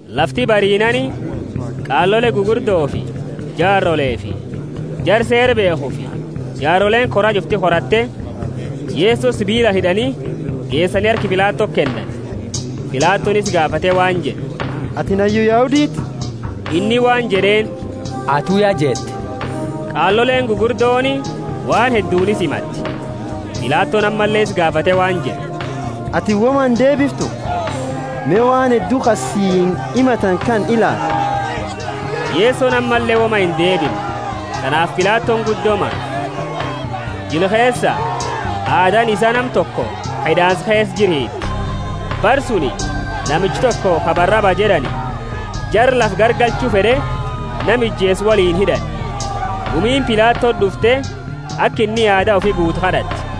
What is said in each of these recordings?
Lafti bariinaani, qaalole gugurdofi jaarolefi jara Seera beekhufi jaaroleeni kora ch'ufti koratte, Yeso sibiilaani hid'ani, geesani harka Pilatoti kennani. Pilatoni isa gaafate waan jed'e, Atini hayyu Yahuditi? Inni waan jed'eeni, Atu ya jette. Qaaloleeni gugurdooni waan hedduuni isa himatte. Pilatoni ammalle isa gaafate waan jed'e, Atini woma indeebiftu? Me, waan heddu ka siini himatani kana ilaali! Yesoni ammalle woma indeebimne, tanaafi Pilatoni guddo mame. Jila keesa aadaani isaa nama toko ka hid'aansa keesa jiru hiiti. Bara suni namicha toko ka Baraba jed'ani, jara lafa garagalchu fed'e nama ijeese woliini hid'ani. Gumiini Pilatoti d'ufte, aka inni aada ufi guutu kad'atte.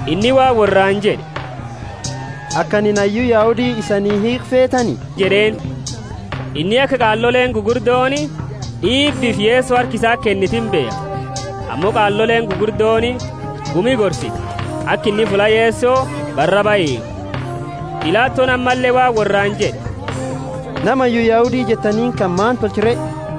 Inni waan worraani jed'e, Aka anini hayyu Yahudi isanii hiikhu feetani? jed'eeni. Inni aka qaaloleeni gugurdooni d'iibifi Yeso harka isati kennite imbeekha. Ammo qaaloleeni gugurdooni gumi gorsite aka inni fulla Yeso Baraba hiikhu. Pilatoni ammalle waan worraani jed'e, Nama hayyu Yahudi jettaniini, kana maani tolcha re?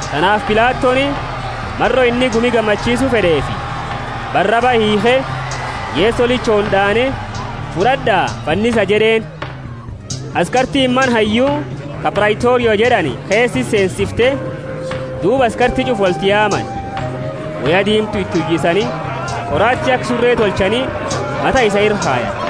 Tanaafi Pilatoni, maro inni gumi gammachiisu fed'eefi, Baraba hiikhe, Yeso lichooni d'aane, Fud'ad'a, fannisa jed'eeni. Askartiini mana hayyu, ka Praitoria jed'ani, keesa isa seensifte, duuba askarti ch'ufa wolti yaamani. Woya diimtu iti uyisani, qoraati aka sure tolchani, mata isaa ira kayani.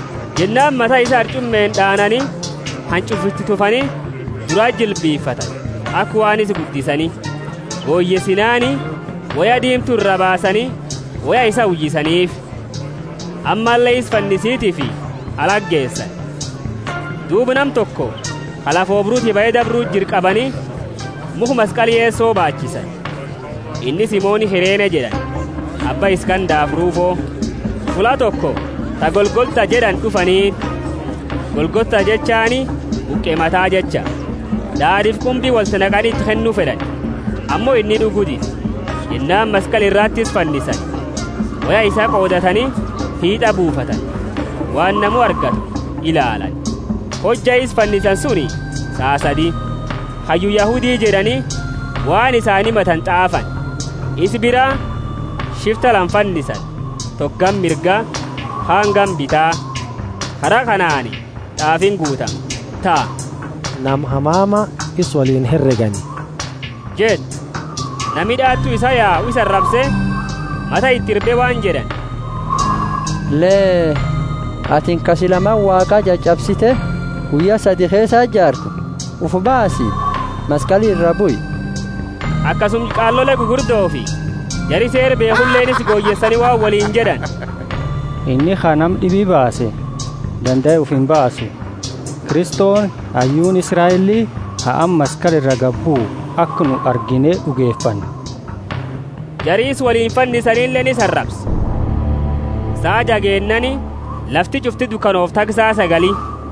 Jennaani mata isaa harch'umeeni d'aanani, hanch'ufa iti tufani, durati jilbifatani, aka waan isa guddisani. Goyeesinaani, woya diimtu iraa baasani, woya isaa uyisaniifi. Ammalle isa fannisitifi alati geesani. Duuba nama toko ka lafa oobruti bahe dabru jiru qabani, mukha maskali Yeso baachisani. Inni Simoni Kirene jed'ani, abba Iskandafi Rufo. Fulla toko ta Golgotha jed'ani d'ufaniini. (Golgotha jechaani Buqe Mata jecha.) Daad'iifi qumbi wolti naqani iti kennu fed'ani, ammo inni d'ugu dide. Jennaani maskali irati isa fannisani, woya isaa qoodatani, hit'a buufatani, waan namu argatu ilaalani. Hojja isa fannisani suni saa sadi. Hayyu Yahudi jed'ani, waan isaani himatani t'aafani. Isa bira shifta lama fannisani, toko gama mirga, kaani gama bita. [ Kara kanaani t'aafiini guutamte ta, Nama hamama isa woliini heregani jettu.] Nami d'aatu isaa yau isa arabse, mata iti irbe waan jed'ani, Lee! Atini ka sila Mana Waaqa ch'ach'absite, guyya sadi keesati jaartu, ufi baasi, maskali iraa bui! Akasuma qaalole gugurdofi jara Seera beekhuleeni isa goyeesani waan woliini jed'ani, Inni ka nama d'ibi baase, dandae ufi imbaasu. Kristoni, hayyuuni Israeli, ha amma maskali ira gadi buu, aka nu argine d'ugefannu. Jari isa woliini fannisanileeni isa arabse. Saa jaa geennaani, lafti ch'ufti dukanoofte haga saa sagali.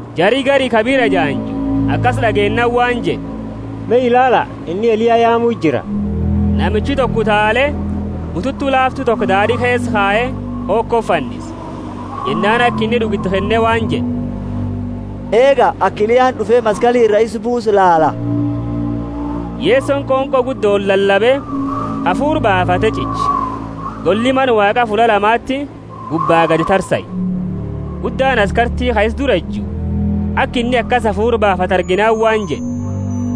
Jari gari ka bira ejaanju akasi d'ageennaani waan jed'e, Me ilaala, inni Eliya yaamu jira. Namichi toko utaale, bututu laaftu toko daad'i keesa kaye, hokoti fannise. Jennaani aka inni d'ugu iti kenne waan jed'e, Eega! Aka Eliyaani d'ufe maskali ira isa buusu laala. Yesoni qonqo guddooni lalabe, hafuura baafate ch'iche. Golli Mana Waaqa fulla lamati gubbaa gadi tarsae. Guddaani askarti ka isa dura eju, aka inni akasi hafuura baafatu arginaani waan jed'e,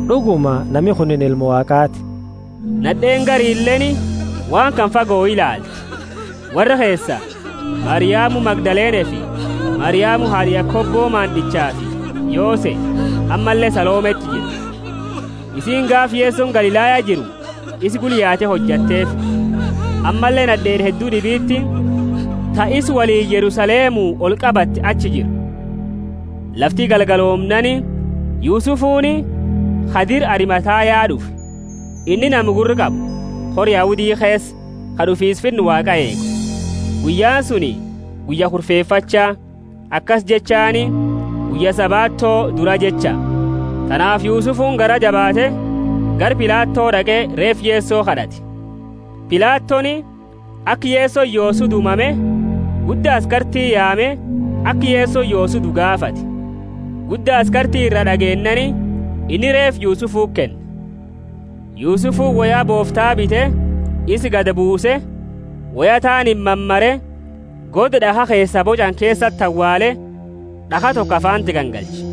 D'uguma nami kunini Ilma Waaqaati. Nad'eeni garileeni waan kana fagoo ilaalte. Worra keesa, Mariamu Magdalenefi Mariamu haad'a Yakobo maand'ichafi Yose, ammalle Salometi jira. Isiini gaafa Yesoni Galilaya jiru isa gula yaate hojateefi. Ammalle nad'eeni heddu d'ibiti, ta isa woliini Yerusalemu olqabatte achi jira. Lafti galgaloomnaani Yusufuni, ka dira Arimathaya d'ufe. Inni nama gurra qabu, kora Yahudi keesa, ka d'ufiisa Finna Waaqa eegu. Guyyaani suni guyya Kurfefacha (akasi jechaani guyya Sabato dura jecha); tanaafi Yusufuni garaa jabaate, gara Pilato d'aqe, reefa Yeso kad'ate. Pilatoni, aka Yesoni yoosu due mame, gudda askarti yaame, aka Yesoni yoosu due gaafate. Gudda askarti ira d'ageennaani, inni reefa Yusufuti kenne. Yusufuni woya boofta bite, isa gadi buuse, woya taaniini mamare, goda d'akha keesaa boch'ani keesati awaale, d'akha toko afaanti gangalche.